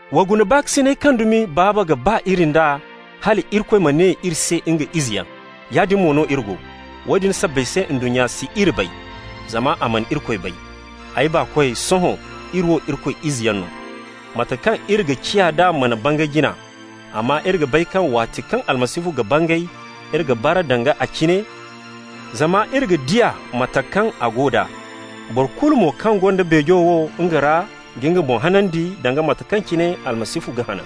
Wa guna baakasinay kaŋ dumi Baaba ga ba iri nd'a, hal Irikoy ma ne iri se nga izeyaŋ. Yaadin mo no iri go. Woodin sabbay se ndunnya si iri bay, zama a mana Irikoy bay. Ay baakoy, sohõ iri wo Irikoy izeyaŋ no. Mate kaŋ iri ga ciya d'a mana bangay jina, amma iri ga bay kaŋ waati kaŋ Almasihu ga bangay, iri ga bara danga a cine, zama iri ga di a mate kaŋ a go d'a. Boro kulu mo kaŋ gonda beejo wo nga ra ga nga boŋ hanandi, danga mate kaŋ cine Almasihu ga hanan.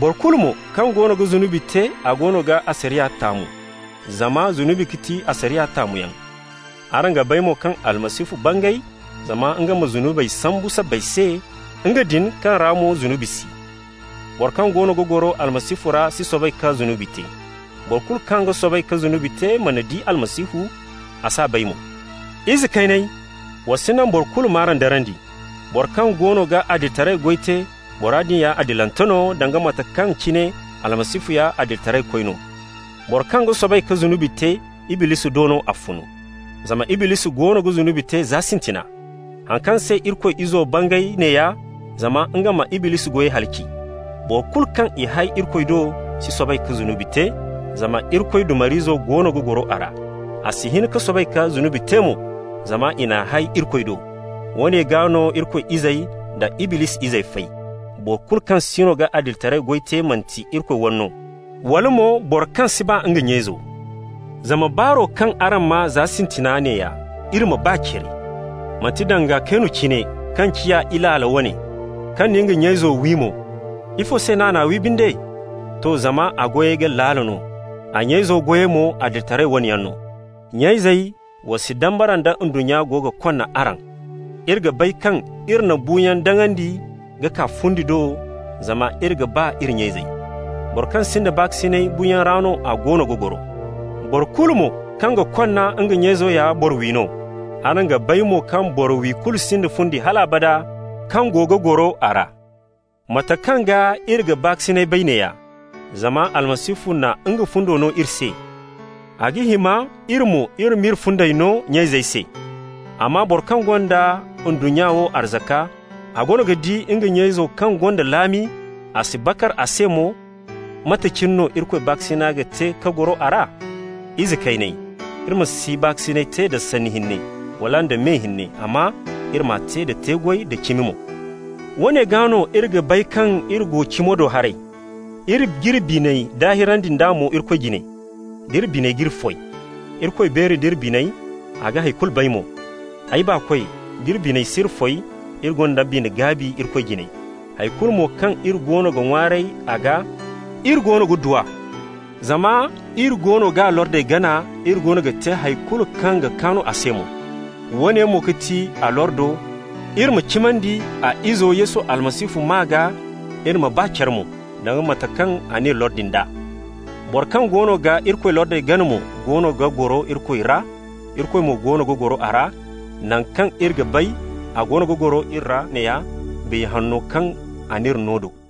Boro kulu mo kaŋ goono ga zunubi te, a goono ga asariya taamu, zama zunubi ga ti asariya taamuyaŋ. Araŋ ga bay mo kaŋ Almasihu bangay zama nga ma zunubey sambu sabbay se, nga din kaŋ ra mo zunubi si. Boro kaŋ goono ga goro Almasihu ra si soobay ka zunubi te. Boro kulu kaŋ ga soobay ka zunubi te mana di Almasihu, a s'a bay mo. Ize kayney, wa si naŋ boro kulu m'araŋ darandi. Boro kaŋ goono ga adilitaray goy te, bora din ya adilante no, danga mate kaŋ cine Almasihu ya adilitaraykoy no. Boro kaŋ ga soobay ka zunubi te, Iblisi do no a fun, zama Iblisi goono ga zunubi te za sintina. Haŋ kaŋ se Irikoy Izo bangay neeya: zama nga ma Iblisi goyey halaci. Boro kulu kaŋ i hay Irikoy do si soobay ka zunubi te, zama Irikoy dumar'izo goono ga goro a ra. A si hin ka soobay ka zunubi te mo zama i n'a hay Irikoy do. Woone gaa no Irikoy izey da Iblisi izey fay: boro kulu kaŋ siino ga adilitaray goy te manti Irikoy wane no, wala mo boro kaŋ si ba nga nya-izo. Zama baaro kaŋ araŋ maa za sintina neeya: Iri ma ba care. Manti danga Kaynu cine, kaŋ ciya Ilaala wane, kaŋ na nga nya izo wi mo. Ifo se no a n'a wi, binde? To, zama a goyey ga laala no, a nya izo goyey mo adilitaray wane yaŋ no. Nya-izey, wa si dambara da ndunnya go ga konna araŋ. Iri ga bay kaŋ iri na buuyaŋ daŋandi ka kaa fundi do zama iri ga ba iri nya-izey. Boro kaŋ sinda baakasinay, buuyaŋ ra no a goono ga goro. Boro kulu mo kaŋ ga konna nga nya-izo ya boro-wi no. Araŋ ga bay mo kaŋ boro-wi kulu sinda fundi hal abada kaŋ go ga goro a ra. Mate kaŋ gaa iri ga baakasinay bay neeya: zama Almasihu na nga fundo no iri se. A ga hima iri mo, iri ma iri fundey no nya-izey se. Amma boro kaŋ gonda ndunnya wo arzaka, a goono ga di nga nya-izo kaŋ gonda laami, a si bakar a se mo, mate cine no Irikoy baakasina ga te ka goro a ra? Ize kayney, iri ma si baakasinay te da sanni hinne, wala da me hinne, amma iri m'a te da te-goy da cimi mo. Woone gaa no iri ga bay kaŋ iri go cimo do haray, iri g'iri biney daahirandi nd'a mo Irikoy jine, d'iri biney g'iri foy: Irikoy beeri nd'iri biney, a ga hay kulu bay mo. Ay baakoy, d'iri biney si iri foy, iri gonda bine-gaabi Irikoy jine. Hay kulu mo kaŋ iri goono ga ŋwaaray a gaa, iri goono ga du a, zama iri goono g'a lordey gana, iri goono ga te hay kulu kaŋ ga kaan a se mo. Woone mo ga ti a lordo: iri ma cimandi a Izo Yesu Almasihu maa gaa, iri ma ba care mo, danga mate kaŋ a n'iri lordi nd'a. Boro kaŋ goono ga Irikoy lordey gana mo goono ga goro Irikoy ra, Irikoy mo goono ga goro a ra. Naŋ kaŋ iri ga bay a goono ga goro iri ra neeya: Biya Hanno kaŋ a n'iri no do.